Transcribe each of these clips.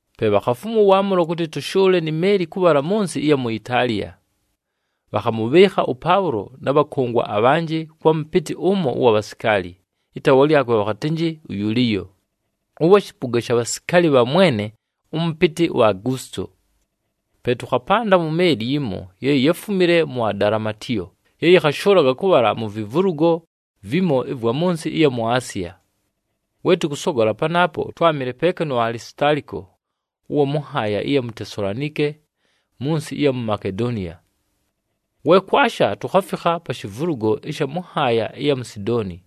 Pe bhakhafumwa ʉwaamʉlo kʉtɨ tʉshʉʉle ni meeli kʉbhala mʉ nsɨ ɨya mu Itaaliya. Bhakhamʉbhɨɨkha ʉPaʉlo na bhakʉngwa abhanjɨ kwa mʉpɨtɨ ʉmo ʉwa bhasikaali, ɨtaawa lyakwe bhakhatɨnjɨ uYuliyo, ʉwa shɨpʉga sha bhasikaali bha mwene ʉmʉpɨtɨ uAgusito. Pe tʉkhapanda mu meeli yimo ye yáfumile mu Adalamitiyo ye yɨkhashʉʉlaga kʉbhala mu vivulugo vimo ɨvwa mʉ nsɨ ɨya mu Asiya. We tʉkʉsogola panaapo, twámɨle peeka nu Alisitaaliko, ʉwa mʉ nhaaya ɨya mu Tesalonike mʉ nsɨ ɨya mu Makedoniya. We kwasha, tukhafikha pa shivulugo ɨsha mʉ nhaaya ɨya mu Sidooni.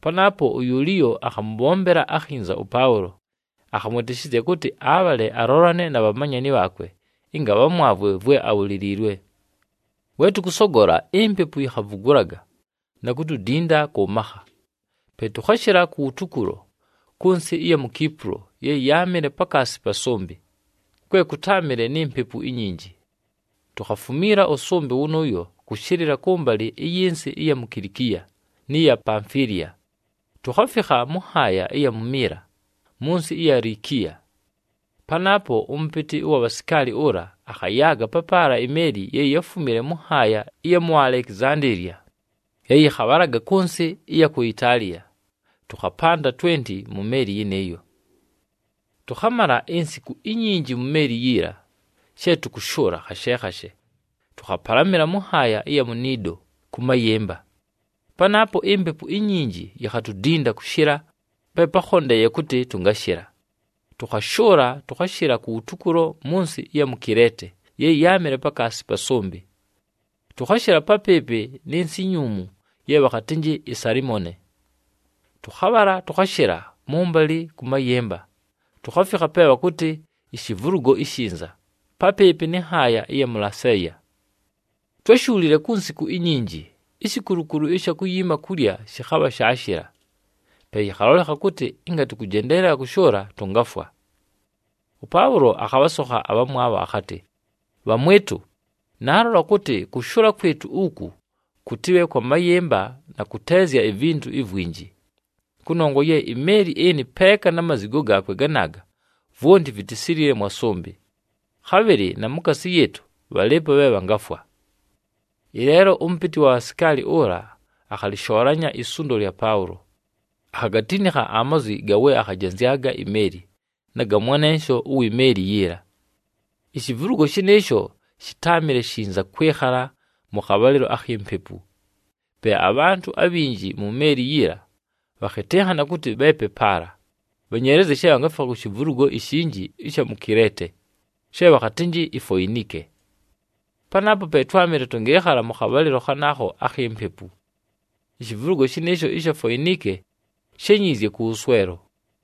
Panaapo uYuliyo akhamʉbhombela akhinza ʉPaʉlo, akhamwɨtɨshɨzya kʉtɨ abhale alolane na bhamanyani bhaakwe, ɨnga bhamwavwe vwe ábhuliliilwe. We tʉkʉsogola, impepu yikhavugulaga na kutudinda kʉ makha. Pe tʉkhashɨla kuwutukulo kʉ nsɨ ɨya mu Kipulo ye yáamɨle pakaasi pa sʉmbɨ, kwe kʉtáamɨle ni mpepu inyinji. Tukhafumiila ʉsʉmbɨ wʉnʉʉyo kʉshɨlɨla kʉmbalɨ ɨyɨ nsɨ ɨya mu Kilikiya nɨ ya Pamfiliya, tukhafikha mʉ nhaaya ɨya mu Mila mʉ nsɨ ɨya Likiya. Panaapo, ʉmʉpɨtɨ ʉwa bhasikaali ʉla akhayaaga papaala imeeli ye yáfumile mʉ nhaaya ɨya mu Alekizandeeliya ye yɨkhabhalaga kʉ nsɨ ɨya ku Itaaliya, tʉkhapanda twenti mu meeli yɨnɨɨyo. Tʉkhamala insiku inyinji mu meeli yiila she tʉkʉshʉʉla khashe khashe, tʉkhapalamɨla mʉ nhaaya ɨya mu Nido kʉ mayɨmba. Panaapo impepu inyinji yikhatudinda kʉshɨla pe pákhondeeye kʉtɨ tʉngashɨla, tʉkhashʉʉla, tʉkhashɨla kuwutukulo mʉ nsɨ ɨya mu Kileete ye yáamɨle pakaasi pa sʉmbɨ, tʉkhashɨla papɨɨpɨ nɨ nsɨ inyuumu ye bhakhatɨnjɨ iSalimone. Tʉkhabhala tʉkhashɨla mʉmbalɨ kʉ mayɨmba, tukhafikha pe bhakʉtɨ, “IShivulugo iShinza,” papɨɨpɨ nɨ nhaaya ɨya mʉ Laseeya. Twáshuulile ku nsiku inyinji, ishikulukulu ɨsha kuyiima kulya shɨkhabha shaashɨla. Pe yɨkhalolekha kʉtɨ ɨnga tʉkʉjendeelela kʉshʉʉla, tʉngafwa. ɄPaʉlo akhabhasokha abhamwabho akhatɨ, “Bhamwɨtʉ, naalola kʉtɨ kʉshʉʉla kwɨtʉ uku kʉtɨbhe kwa mayɨmba na kʉteezya ivintu ivwinji. Kʉnongwa ye imeeli ɨnɨ peeka na mazigo gaakwe ganaaga, vwonti vitisilile mwa sʉmbɨ. Khabhɨlɨ na mukaasi yɨɨtʉ, bhalɨɨpo bhe bhangafwa.” Ɨleelo ʉmʉpɨtɨ wa bhasikaali ʉla akhalɨshoolanya isundo lya Paʉlo, akhagatinikha amazwi ga we akhajenzyaga imeeli, na ga mwanensho uwi meeli yiila. Ishivulugo shɨnɨɨsho shɨtáamɨle shinza kwɨkhala mʉ khabhalɨlo akhi mpepu. Pe abhantʉ abhinji mu meeli yiila bhakhɨtɨnhana kʉtɨ bheepe paala, bhenyeelezye she bhangafikha ku shivulugo ishinji ɨsha mu Kileete, she bhakhatɨnjɨ iFoinike. Panaapo pe twámɨle tʉngɨɨkhala mʉ khabhalɨlo khanaakho akhi mpepu. Ishivulugo shɨnɨɨsho ɨsha Foinike shényiizye kʉwʉswelo.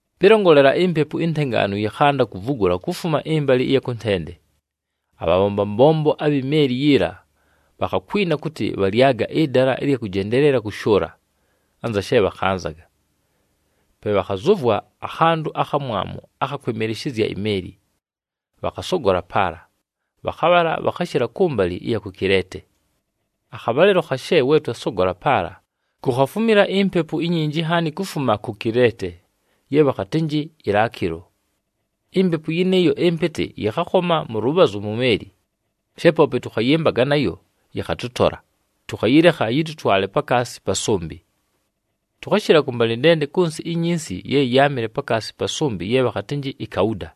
Pɨlongolela, impepu intengaanu yɨkhanda kuvugula kufuma ɨmbalɨ ɨya kʉntende. Abhabhomba mbombo abhi meeli yiila bhakhakwina kʉtɨ bhalyaga ɨdala ɨlya kʉjendeelela kʉshʉʉla, anza she bhakhanzaga. Pe bhakhazʉvwa akhantʉ akhamwamu akha kwɨmɨlɨshɨzya imeeli, bhakhasogola paala, bhakhabhala bhakhashɨla kʉmbalɨ ku Kileete. Akhabhalɨlo khashe we twasogola paala, kukhafumila impepu inyinji nhaani kufuma ku Kileete, ye bhakhatɨnjɨ iLakilo. Impepu yɨnɨɨyo ɨmpɨtɨ yɨkhakhoma mʉ lʉbhazʉ mu meeli. She poope tʉkhayɨmbaga nayo, yɨkhatʉtola, tʉkhayɨlekha yɨtʉtwale pakaasi pa sʉmbɨ. Tʉkhashɨla kʉmbalɨntende kʉ nsɨ inyinsi ye yáamɨle pakaasi pa sʉmbɨ ye bhakhatɨnjɨ iKauda,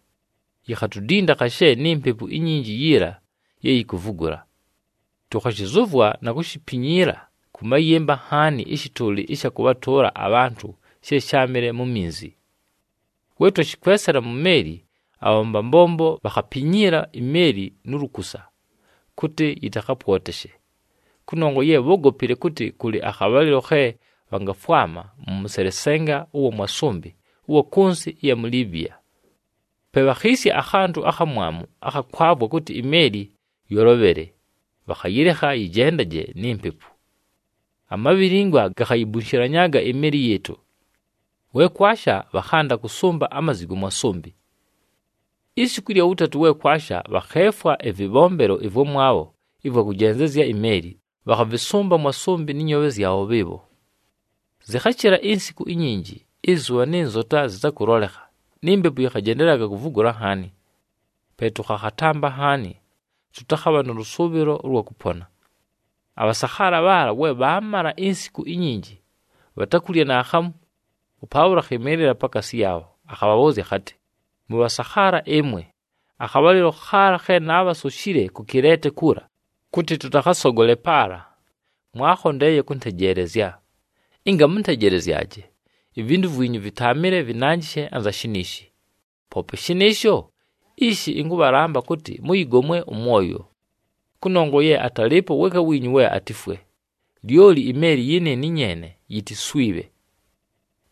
yikhatudinda khashe ni mpepu inyinji yiila ye yikuvugula. Tʉkhashɨzʉvwa na kushipinyiila kʉ mayɨmba nhaani ɨshɨtʉʉlɨ ɨsha kʉbhatʉʉla abhantʉ she sháamɨle mu minzi. We twashɨkwesela mu meeli, abhabhomba mbombo bhakhapinyiila imeeli nu lukusa, kʉtɨ yɨtakhapwoteshe. Kʉnongwa ye bhógopile kʉtɨ kʉlɨ akhabhalɨlo khe bhangafwama mʉ mʉselesenga ʉwa mwa sʉmbɨ ʉwa kʉ nsɨ ɨya mu Libiya. Pe bhakhiisya akhantʉ akhamwamu akha kwavwa kʉtɨ imeeli yolobhele, bhakhayɨlekha yɨjendaje ni mpepu. Amabhilingwa gakhayibunshilanyaaga imeeli yɨɨtʉ. We kwasha, bhakhanda kʉsʉmba amazigo mwa sʉmbɨ. Isiku ɨlya wʉtatʉ we kwasha, bhakheefwa ɨvɨbhombelo ɨvwamwabho ɨvwa kʉjenzezya imeeli, bhakhavɨsʉmba mwa sʉmbɨ nɨ nyoobhe zyabho bhɨɨbho. Zɨkhashɨla insiku inyinji, ɨzʉbha nɨ nzota zɨtakʉlolekha, ni mpepu yɨkhajendelelaga kuvugula nhaani, pe tʉkhakhatampa nhaani tʉtakhabha nʉ lʉsʉʉbhɨlo ʉlwa kʉpona. Abhasakhaala bhaala, we bhaamala insiku inyinji bhatakulya naakhamu, ʉPaʉlo akhɨmɨɨlɨla pakaasi yaabho, akhabhabhʉʉzya akhatɨ, “Mʉbhasakhaala ɨmwe, akhabhalɨlo khaala khe naabhasoshile ku Kileete kuula kʉtɨ tʉtakhasogole paala, mwaakhondeeye kʉntejeelezya. Ɨnga mʉntejelezyaje, ivintu vwinyu vɨtaamɨle vɨnanjɨshe anza shiniishi. Poope shɨnɨɨsho, ishi ɨnkʉbhalamba kʉtɨ mʉyɨgomwe ʉmwoyo. Kʉnongwa ye atalɨɨpo weeka wiinyu we atifwe, lyoli imeeli yɨnɨɨnɨ nyeene ye yitiswibhe.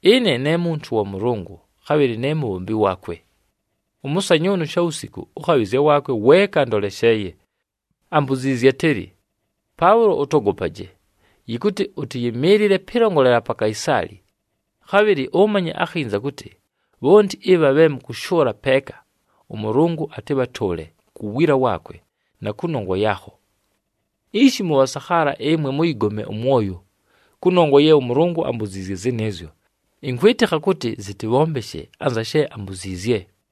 Ɨne ne muntu wa Mʉlʉngʉ, khabhɨlɨ ne mubhombi waakwe. Ʉmʉsanyʉʉnʉ shawusiku ʉkhabhɨzya waakwe weeka andolesheeye, ambuziizye atɨlɨ, ‘Paʉlo, ʉtogopaje! Yɨkʉtɨ ʉtɨyɨmɨɨlɨle pɨlongolela pa Kaisaali. Khabhɨlɨ ʉmanye akhinza kʉtɨ bhonti ɨbha bhe mʉkʉshʉʉla peeka, ʉMʉlʉngʉ atɨbhatʉʉle ku wiila waakwe na kʉnongwa yaakho.’ Ishi, mʉbhasakhaala ɨmwe mʉyɨgomwe ʉmwoyo, kʉnongwa ye ʉMʉlʉngʉ ambuziizye zɨnɨɨzyo, ɨnkwɨtɨkha kʉtɨ zɨtɨbhombeshe anza she ambuziizye.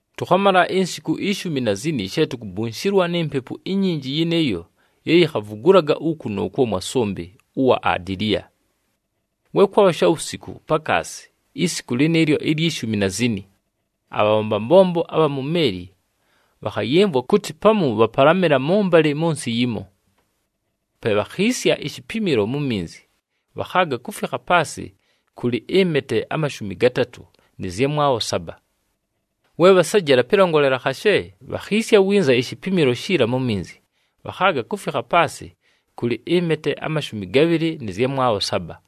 Tʉkhamala insiku ishumi na zini she tukubunshilwa ni mpepu inyinji yɨnɨɨyo ye yikhavugulaga uku nʉʉkwo mwa sʉmbɨ ʉwa Adiliya. We kwabha shawusiku pakaasi, isiku lɨnɨɨlyo ilyi shumi na zini, abhabhomba mbombo abha mu meeli bhakhayɨmvwa kʉtɨ pamu bhapalamɨla mʉmbalɨ mʉ nsɨ yimo. Pe bhakhiisya ishipimilo mu minzi, bhakhaaga kufikha paasɨ kʉlɨ ɨmete amashumi gatatʉ nɨ zyamwabho saba. We bhasejela pɨlongolela khashe, bhakhiisya winza ishipimilo shiila mu minzi, bhakhaaga kufikha paasɨ kʉlɨ ɨmete amashumi gabhɨlɨ nɨ zyamwabho saba.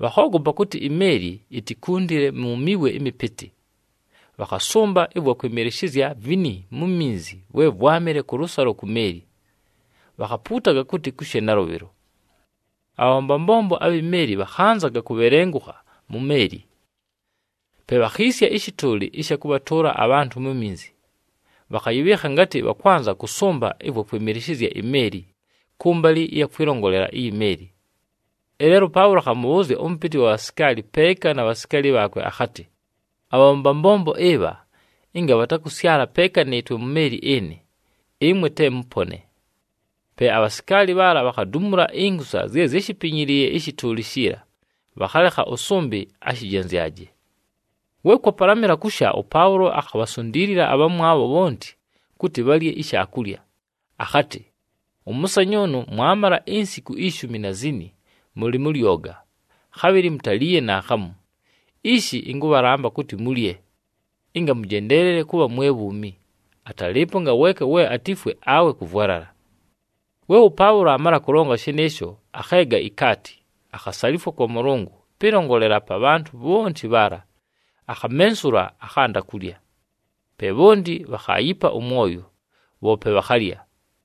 Bhakhoogopa kʉtɨ imeeli itikundile mu miwe ɨmɨpɨtɨ, bhakhasʉmba ɨvwa kwɨmɨlɨshɨzya vini mu minzi vwe vwámɨle kʉlʉsalo ku meeli. Bhakhapuutaga kʉtɨ kushe nalʉbhɨlo. Abhabhomba mbombo abhi meeli bhakhanzaga kubhelengukha mu meeli. Pe bhakhiisya ɨshɨtʉʉlɨ ɨsha kʉbhatʉʉla abhantʉ mu minzi, bhakhayɨbhɨɨkha ngatɨ bhakwanza kʉsʉmba ɨvwa kwɨmɨlɨshɨzya imeeli kʉmbalɨ ɨya kwɨlongolela iyi meeli. Ɨleelo ʉPaʉlo akhamʉbhʉʉzya ʉmʉpɨtɨ wa bhasikaali peeka na bhasikaali bhaakwe, akhatɨ, “Abhabhomba mbombo ɨbha, ɨnga bhatakʉsyala peeka nɨɨtwe mu meeli ɨnɨ, ɨmwe te mʉpone.” Pe abhasikaali bhaala bhakhadumula inkusa zye zyáshipinyiliiye ɨshɨtʉʉlɨ shiila, bhakhalekha ʉsʉmbɨ ashɨjenzyaje. We kwapalamɨla kusha, ʉPaʉlo akhabhasundiilila abhamwabho bhonti kʉtɨ bhalye ishaakulya, akhatɨ, “Ʉmʉsanyʉʉnʉ mwamala insiku ishumi na zini mʉlɨ mʉ lyoga, khabhɨlɨ mutaliiye naakhamu. Ishi ɨnkʉbhalamba kʉtɨ mulye, ɨnga mʉjendeelele kʉbha mwe bhuumi. Atalɨɨpo ngaweeka we atifwe, awe kʉvwalala.” We ʉPaʉlo aamala kʉlonga shɨnɨɨsho, akheega ikaati, akhasalifwa kwa Mʉlʉngʉ pɨlongolela pa bhantʉ bhonti bhaala, akhamensula, akhanda kulya. Pe bhonti bhakhaayipa ʉmwoyo, bhoope bhakhalya.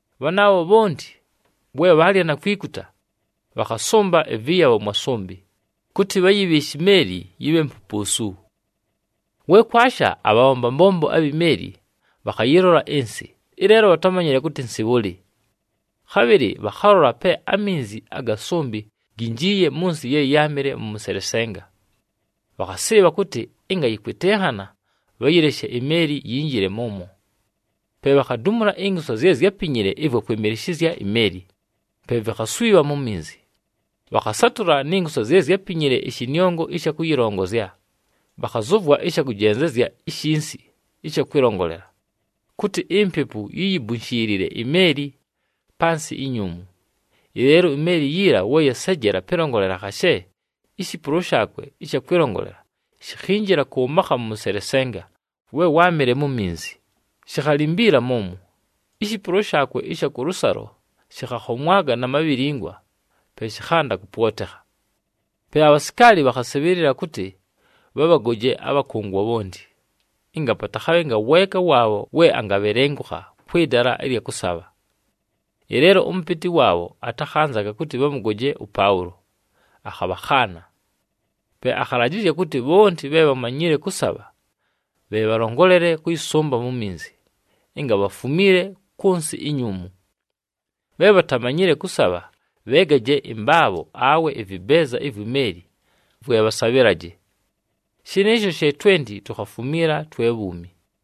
Bhanaabho bhonti, we bhaalya na kwikuta, bhakhasʉmba ɨvɨyabho mwa sʉmbɨ, kʉtɨ bhayɨbhɨɨshe imeeli yɨbhe mpupuusu. We kwasha, abhabhomba mbombo abhi meeli bhakhayɨlola ɨnsɨ, ɨleelo bhatámanyile kʉtɨ nsɨ bhʉlɨ. Khabhɨlɨ bhakhalola pe aminzi aga sʉmbɨ ginjiiye mʉ nsɨ ye yáamɨle nʉ mʉselesenga. Bhakhasɨɨbha kʉtɨ ɨnga yɨkwɨtɨnhana, bhayɨleshe imeeli yinjile mʉmwo. Pe bhakhadumula inkusa zye zyápinyile ɨvwa kwɨmɨlɨshɨzya imeeli, pe vikhaswibha mu minzi. Bhakhasatʉla ni nkusa zye zyápinyile ɨshɨnɨongo ɨsha kʉyɨlongozya, bhakhazʉvwa ɨsha kʉjenzezya ishinsi ɨsha kwɨlongolela, kʉtɨ impepu yiyibunshiilile imeeli pa nsɨ inyuumu. Ɨleelo imeeli yiila we yasejela pɨlongolela khashe, ishipulo shaakwe ɨsha kwɨlongolela shikhinjila kʉ makha mʉ mʉselesenga we wáamɨle mu minzi, shikhalimbiila mʉmwo. Ishipulo shaakwe ɨsha kʉlʉsalo shɨkhakhomwaga na mabhilingwa, pe shɨkhanda kʉpwotekha. Pe abhasikaali bhakhasɨbhɨɨlɨla kʉtɨ bhabhagoje abhakʉngwa bhonti, ɨnga patakhabhe ngaweeka waabho we angabhelengukha kwɨ dala ɨlya kʉsabha. Ɨleelo ʉmʉpɨtɨ waabho atakhanzaga kʉtɨ bhamʉgoje ʉPaʉlo, akhabhakhaana. Pe akhalajɨzya kʉtɨ bhonti bhe bhamanyile kʉsabha bhe bhalongolele kʉyɨsʉmba mu minzi, ɨnga bhafumiile kʉ nsɨ inyuumu. Bhe bhatamanyile kʉsabha bheegaje ɨmbaabho, awe ɨvɨbeeza ivwi meeli, vwe bhasabhɨlaje. Shɨnɨɨsho she twenti tukhafumiila twe bhuumi.